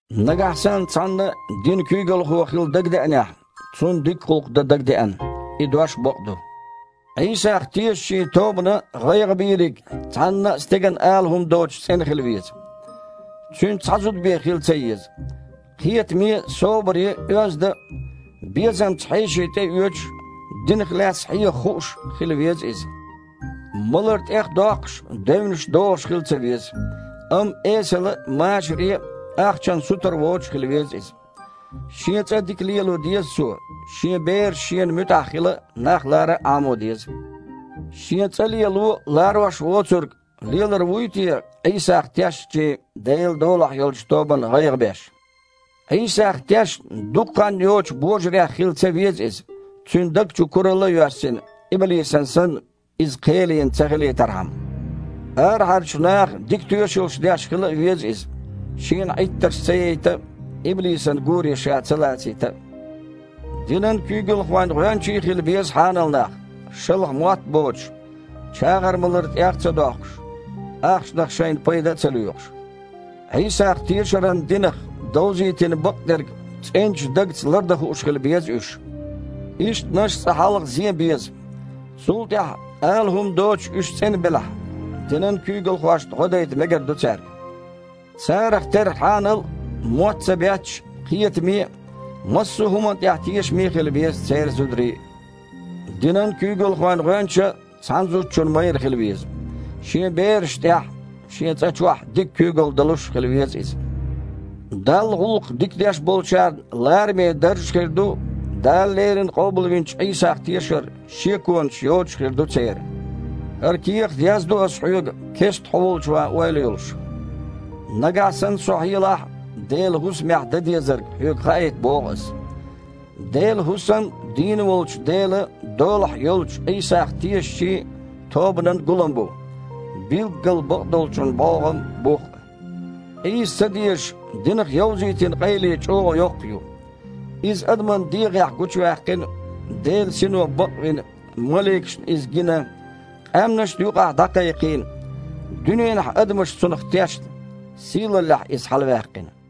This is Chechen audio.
Нагахь санна цхьанна динан куьйгалхо хила дагадеанехь, цунна дика гІуллакх дан дагадеана. И дош бакъ ду. Іийсах тешачийн тобанан гІайгІабийриг цхьанна а стеган ала хІума доцуш цІена хила веза. Цуьнан цхьа зуда бен хила ца еза. Кхетаме а, собаре а, оьзда а, безамца хьеший тІеоьцуш а, динах лаьцна хьеха хууш а хила веза иза. Малар тІехдоккхуш, девнаш дохуш хила ца веза. Амма эсала а, машаре а, ахчанна сутара воцуш а хила веза иза. Шен цІа дика лело а деза цо, шен бераш шена муьтІахь хила а, нах лара а Іамо деза. Шен цІа лело а ларош воцург лелар вуй те Іийсах тешначийн Делан долахь йолчу тобанан гІайгІа беш? Іийсах тешна дукха хан йоцучу божарех хила ца веза иза, цуьнан даг чу куралла а йоьссина, иблисана санна, иза кхел йина ца хилийтархьама. Арахьарчу наха дика тоьшаллаш деш хила а веза иза, шена Іиттарш ца яйта а, иблисан гуре ша ца лацийта а. Динан куьйгалхойн гІоьнчий а хила беза хьанал нах, шалха мотт а боцуш, чагІар малар тІех а ца доккхуш, ахчанах шайна пайда а ца лоьхуш. Іийсах тешаран динах довзийтина бакъдерг цІеначу дагца лардан хууш хила беза уьш. Ишттанаш а цкъа хьалха зен беза. Цул тІаьхьа, ала хІума доцуш уьш цІена белахь, динан куьйгалхошна гІо дайта мегар ду цаьрга. Царах терра хьанал а, мотт ца бетташ а, кхетаме а, массо а хІуманна тІехь тешаме а хила беза церан зударий а. Динан куьйгалхойн гІоьнча а цхьана зудчун майра хила веза. Шен берашна тІехь а, шен цІа чохь а дика куьйгалла далуш а хила веза иза. Далла гІуллакх дика деш болчарна лараме дарж а хир ду, Дала леррина къобалвинчу Іийсах тешар шеконаш йоцуш а хир ду церан. ХІара кехат яздо ас хьоьга, кестта хьо волчу ван ойла йолуш. Нагахь санна со хьелахь а, Делан хІусамехь дан дезарг хьоьга хаийта боху ас. Делан хІусам дийна волчу Делан долахь йолчу Іийсах тешачийн тобанан гулам бу – билггал бакъдолчун бІогІам а, бух а. Къийса ца дезаш, динах йовзийтина къайле чІогІа йоккха ю: Иза адаман дегІехь гучуваьккхина, Делан Сино бакъвина, маликашна Иза гина, къаьмнашна юкъахь дІакхайкхийна, дуьненахь адамаш Цунах тешна, сийлаллехь Иза хьалаваьккхина.